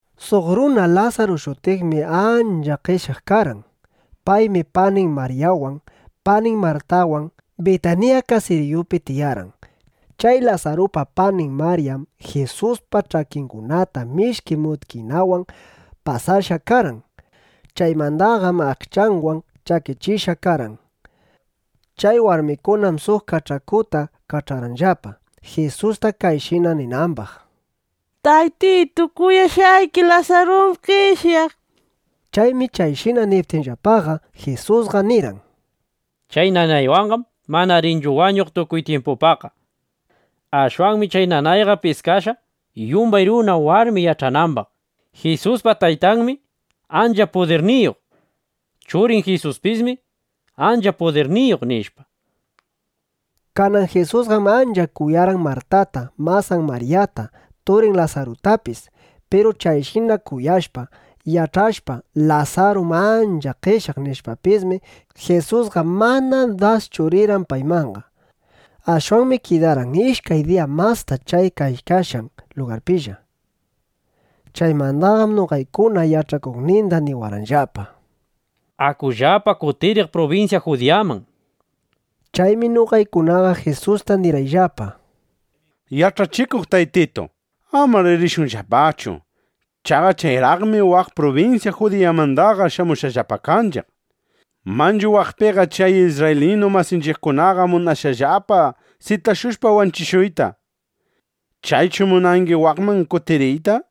Suq runa Lasaru shutiqmi ancha qeshyaq karqan. Paymi panin Maryawan, panin Martawan Bitanilla (Bitaniya) kasiriyupi tiyarqan. Chay Lasarupa panin Maryam Jisuspa ch'akingunata mishki mutkinawan pasashqa karqan. Chaymandaqam aqchanwan chakichishqa karqan. Chay warmikunam suq kach'akuta kach'arqanllapa, Jisusta kayshina ninambaq: —Taytitu, kuyashqayki Lasarum qeshyaq, nishpa. Chaymi chayshina niptinllapaqa, Jisusqa nirqan: —Chay nanaywanqam mana rinchu wañuq tukuy tyimpupaqqa. Ashwanmi chay nanayqa piskashqa, yumbay runa, warmi yach'anambaq: Jisuspa Taytanmi ancha pudirniyuq. Churin Jisuspismi ancha pudirniyuq, nishpa. Kanan Jisusqam ancha kuyarqan Martata, masan Maryata, turin Lasarutapis. Piru chayshina kuyashpa, yach'ashpa: Lasarum ancha qeshyaq, nishpapismi, Jisusqa mana daschu rirqan paymanqa. Ashwanmi kidarqan ishkay diya masta chay kaykashqan lugarpilla. Chaymandaqam noqaykuna yach'akuqninda niwarqanllapa: —Akullapa kutiriq prubinsya Judiyaman, nishpa. Chaymi noqaykunaqa Jisusta nirqayllapa: —Yach'achikuq Taytitu, amar rishunllapachu. Chaqa chayraqmi waq prubinsya Judiyamandaqa shamushqallapa kanchiq. Manchu waqpiqa chay isrraylinu masinchiqkunaqa munashqallapa sitashushpa wanchishuyta. ¿Chaychu munangi waqman kutiriyta? nishpa.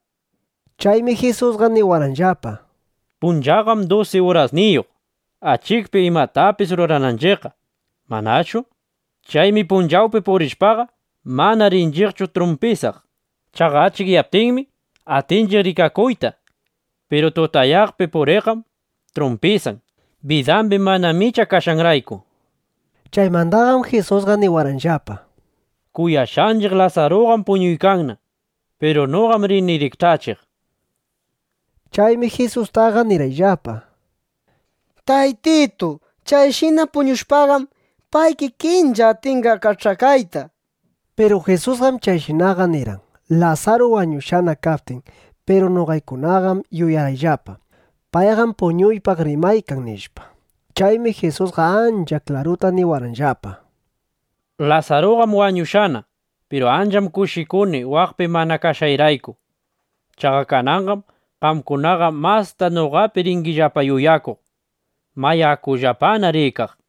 Chaymi Jisusqa niwarqanllapa: —Punchawqam dusi urasniyuq, achikpi imatapis rurananchiqqa, ¿manachu? Chaymi punchawpi purishpaqa, mana rinchiqchu trumpisaq. Chaqa achikyaptinmi, atinchiq rikakuyta. Piru tutayaqpi puriqqam trumpisan, bidambi mana micha kashqanrayku. Chaymandaqam Jisusqa niwarqanllapa: —Kuyashqanchiq Lasaruqam puñuykanna. Piru noqam rini rikch'achiq, nishpa. Chaymi Jisustaqa nirqayllapa: —Taytitu, chayshina puñushpaqam, pay kikinlla atinqa kach'akayta, nishpa. Piru Jisusqam chayshinaqa nirqan, Lasaru wañushqana kaptin. Piru noqaykunaqam yuyarqayllapa: Payqam puñuypaq rimaykan, nishpa. Chaymi Jisusqa ancha klaruta niwarqanllapa: —Lasaruqam wañushqana. Piru ancham kushikuni waqpi mana kashqayrayku. Chaqa kananqam qamkunaqa mastana noqapi ringillapa yuyakuq. Mayá, akullapana rikaq, nishpa.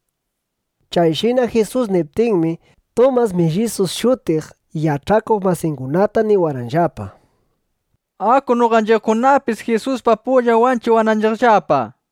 Chayshina Jisus niptinmi, Tumas “Millisu” shutiq, yach'akuq masingunata niwarqanllapa: —Aku noqanchiqkunapis, Jisuspa pullan wanchiwananchiqllapa, nishpa.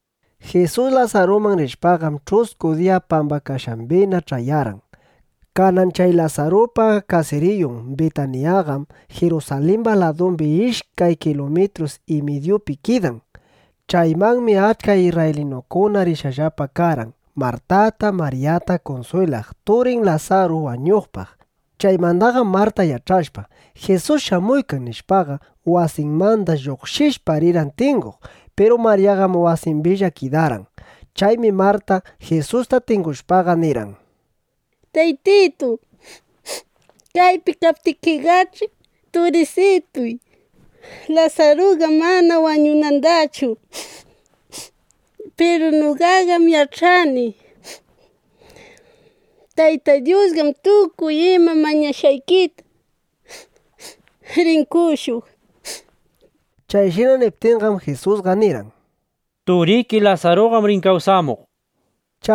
Jisus Lasaruman rishpaqam, ch'usku diya pambakashqambina ch'ayarqan. Kanan chay Lasarupa kasiriyun Bitanillaqam (Bitaniyaqam) Jirusalimba ladumbi ishkay kilumitrus y midyupi kidan. Chaymanmi achka isrraylinukuna rishqallapa karqan, Martata, Maryata kunswilaq turin Lasaru wañuqpaq. Chaymandaqam Marta yach'ashpa: Jisus shamuykan, nishpaqa, wasinmanda lluqshishpa, rirqan tinguq. Piru Maryaqam wasimbilla kidarqan. Chaymi Marta Jisusta tingushpaqa, nirqan: —Taytitu, kaypi kaptikiqach'i, turisituy Lasaruqa mana wañunandachu. Piru noqaqam yach'ani: Tayta Dyusqam tukuy ima mañashqaykita rin qoshuq, nishpa. Chayshina niptinqam, Jisusqa nirqan: —Turiki Lasaruqam rin kawsamuq, nishpa.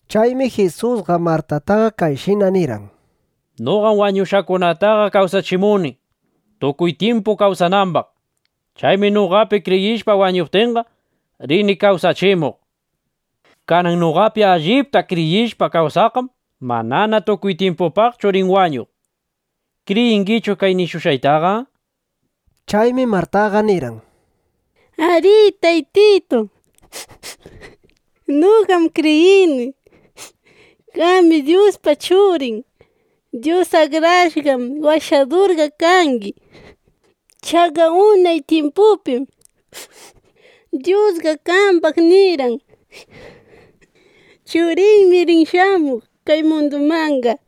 Chaymi Jisusqa Martataqa kayshina nirqan: —Noqam wañuqkunataqa kawsachimuni, tukuy tyimpu kawsanambaq. Chaymi noqapi kriyishpa wañuptinqa, rini kawsachimuq. Kanan noqapi allipta kriyishpa kawsaqqam manana tukuy tyimpupaqchu rin wañuq. ¿Kriyingichu kay nishushqaytaqa? nishpa. Chaymi Martaqa nirqan: —Arí, Taytitu, noqam kriyini: Qami Dyuspa Churin, Dyus Akrashqan Washadurqa kangi, nishpa. Chaqa unay tyimpupim Dyusqa qambaq nirqan: “Churiymi rin shamuq kay munduman”, nishpa.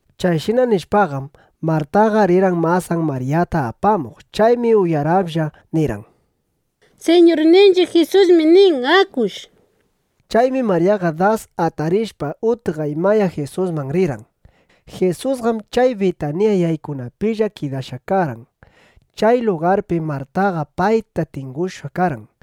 Chayshina nishpaqam, Martaqa rirqan masan Maryata apamuq. Chaymi uyaraplla (uyaralla) nirqan: —Siñurninchiq Jisusmi nin: Akush, nishpa. Chaymi Maryaqa das atarishpa, utqaymaya Jisusman rirqan. Jisusqam chay Bitanilla (Bitaniya) yaykunapilla kidashqa karqan. Chay lugarpim Martaqa payta tingushqa karqan.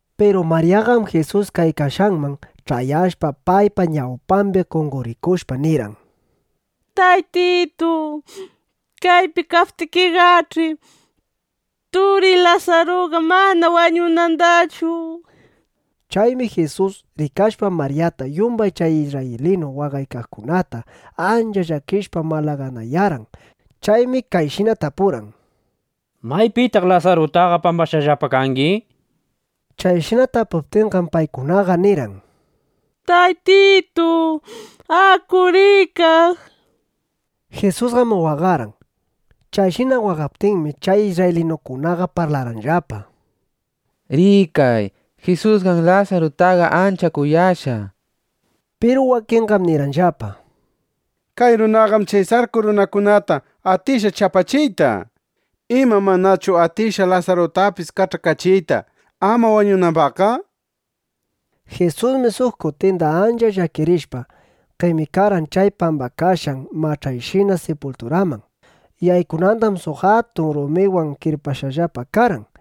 Piru Maryaqam Jisus kaykashqanman ch'ayashpa, paypa ñawpambi qonqorikushpa, nirqan: —Taytitu, kaypi kaptikiqach'i, turiy Lasaruqa mana wañunandachu, nishpa. Chaymi Jisus, rikashpa Maryata yumbay chay isrraylinu waqaykaqkunataqa, ancha llakishpa, malaganayarqan. Chaymi kayshina tapurqan: —¿Maypitaq Lasarutaqa pambashqallapa kangi? nishpa. Chayshina tapuptinqam, paykunaqa nirqan: —Taytitu, aku rikaq, nishpa. Jisusqam waqarqan. Chayshina waqaptinmi, chay isrraylinukunaqa parlarqanllapa: —Rikay, Jisusqam Lasarutaqa ancha kuyashqa, nishpa. Piru wakinqam nirqanllapa: —Kay runaqam chay sarku runakunata atishqa chapachiyta. ¿Ima manachu atishqa Lasarutapis kach'akachiyta, ama wañunambaqqa? nishpa. Jisusmi suq kutinda ancha llakirishpa, qemikarqan chay pambakashqan mach'ayshina sipulturaman. Yaykunandam suq atun rumiwan kirpashqallapa karqan.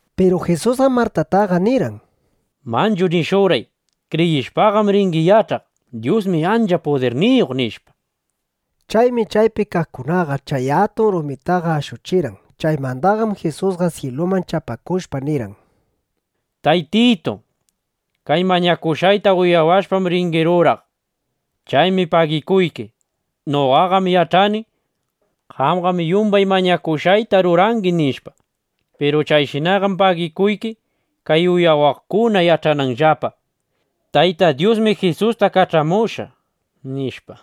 Piru Jisusqam Martataqa nirqan: —Manchu nishurqay, “Kriyishpaqam ringi yach'aq: Dyusmi ancha pudirniyuq”, nishpa. Chaymi chaypi kaqkunaqa chay atun rumitaqa ashuchirqan. Chaymandaqam Jisusqa syiluman chapakushpa, nirqan: —Taytitu, kay mañashushqayta uyawashpam ringi ruraq. Chaymi pagikuyki. Noqaqam yach'ani: Qamqam yumbay mañashushqayta rurangi, nishpa. Piru kayshinaqam pagikuyki, kay uyawaqkuna yach'ananllapa: Tayta Dyusmi Jisusta kach'amushqa, nishpa.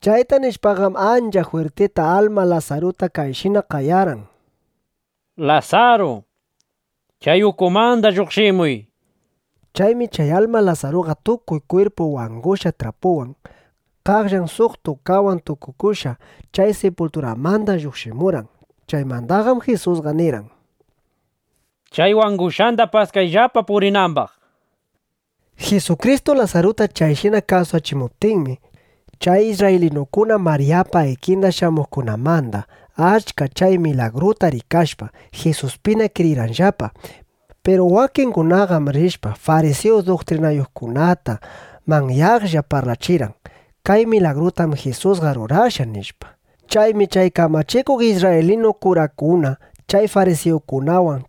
Chayta nishpaqam, ancha jwirtita alma Lasaruta kayshina qayarqan: —¡Lasaru, chay ukumanda lluqshimuy! nishpa. Chaymi chay alma Lasaruqa tukuy kwirpun wangushqa trapuwan, qaqllan suq tukawan tukukushqa chay sipulturamanda lluqshimurqan. Chaymandaqam Jisusqa nirqan: —Chay wangushqanda paskayllapa purinambaq, nishpa. Jisukristu Lasaruta chayshina kawsachimuptinmi, chay isrraylinukuna Maryapa ikinda shamuqkunamanda achka chay milagruta rikashpa, Jisuspina kriyirqanllapa. Piru wakingunaqam rishpa, farisiyu duktrinayuqkunata manyaqlla parlachirqan: —Kay milagrutam Jisusqa rurashqa, nishpa. Chaymi chay kamachikuq isrraylinu kurakuna chay farisiyukunawan,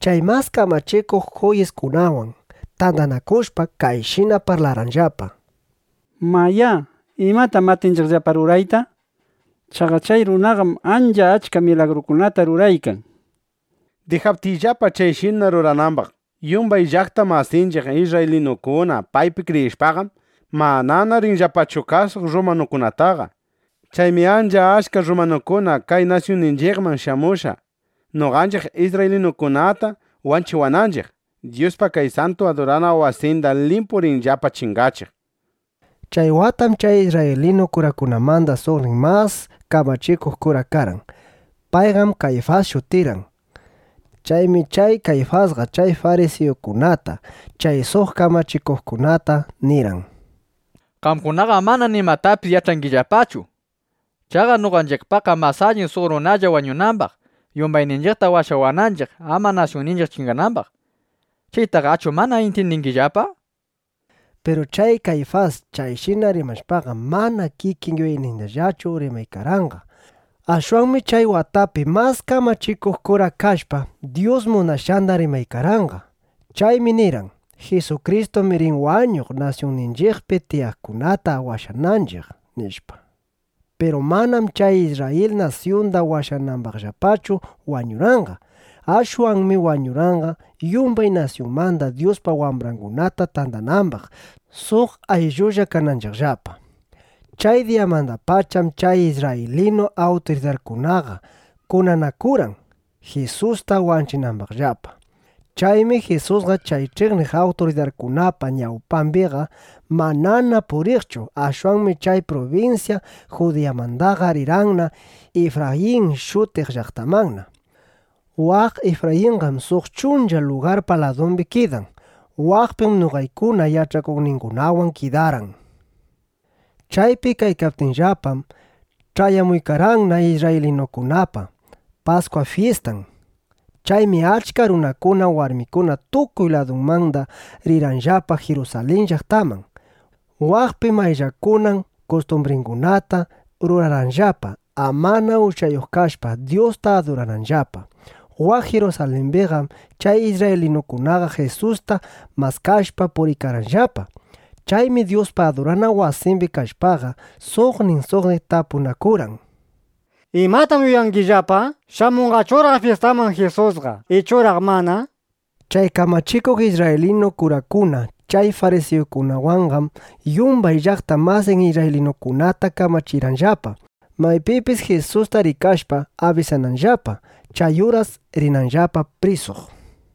chay Mas Kamachikuq Juyiskunawan tandanakushpa, kayshina parlarqanllapa: —Mayá, ¿imatam atinchiqllapa rurayta? Chaqa chay runaqam ancha achka milagrukunata ruraykan. Dijaptinchiqllapa chayshina ruranambaq, yumbay llaqta masinchiq isrraylinukuna paypi kriyishpaqam, manana rinllapachu kasuq rrumanukunataqa. Chaymi ancha achka rrumanukuna kay nasyunninchiqman shamushpa, noqanchiq isrraylinukunata wanchiwaqninchiq, Dyuspa kay santu adurana wasinda limpu rinllapa chingachiq, nishpa. Chay watam chay isrraylinu kurakunamanda suqnin mas kamachikuq kura karqan. Payqam Kayfas shutirqan. Chaymi chay Kayfasqa chay farisiyukunata, chay suq kamachikuqkunata nirqan: —Qamkunaqam mana nimatapis yach'angillapachu. Chaqa noqanchiqpaqqam mas alli suq runalla wañunambaq, yumbayninchiqta washawananchiq, ama nasyunninchiq chinganambaq. ¿Chaytaqachu mana intyindingillapa? nishpa. Piru chay Kayfas chayshina rimashpaqam, mana kikin yuyaynindallachu rimaykarqanqa. Ashwanmi chay watapi mas kamachikuq kura kashpa, Dyus munashqanda rimaykarqanqa. Chaymi nirqan: “Jisukristum rin wañuq nasyunninchiqpi tiyaqkunata washawananchiq”, nishpa. Piru manam chay Isrrayil nasyunda washanambaqllachu wañurqanqa. Ashwanmi wañurqanqa, yumbay nasyunmanda Dyuspa wambrangunata tandanambaq, suq ayllulla kananchiqllapa. Chay diyamandapacham chay isrraylinu awturidarkunaqa kunanakurqan, Jisusta wanchinambaqllapa. Chaymi Jisusqa chay ch'iqniq awturidarkunapa ñawpambiqa manana puriqchu. Ashwanmi chay prubinsya Judiyamandaqa rirqanna Ifrayin shutiq llaqtamanna. Waq Ifrayinqam suq chuncha lugarpa ladumbi kidan. Waqpim noqaykuna yach'akuqningunawan kidarqan. Chaypi kaykaptiyllapam, ch'ayamuykarqanna isrraylinukunapa Paskwa fyistan. Chaymi achka runakuna, warmikuna tukuy ladumanda rirqanllapa Jirusalin llaqtaman. Waqpi mayllakunan kustumbringunata rurarqanllapa, amana uchayuq kashpa, Dyusta adurananllapa. Waq Jirusalimbiqam chay isrraylinukunaqa Jisusta maskashpa, puriykarqanllapa. Chaymi Dyuspa adurana wasimbi kashpaqa, suqnin suqnin tapunakurqan: —¿Imatam yuyangillapa? ¿Shamunqachuraq fyistaman Jisusqa, ichuraq mana? nishpa. Chay kamachikuq isrraylinu kurakuna, chay farisiyukunawanqam yumbay llaqta masin isrraylinukunata kamachirqanllapa, maypipis Jisusta rikashpa, abisananllapa, chay uras rinanllapa prisuq.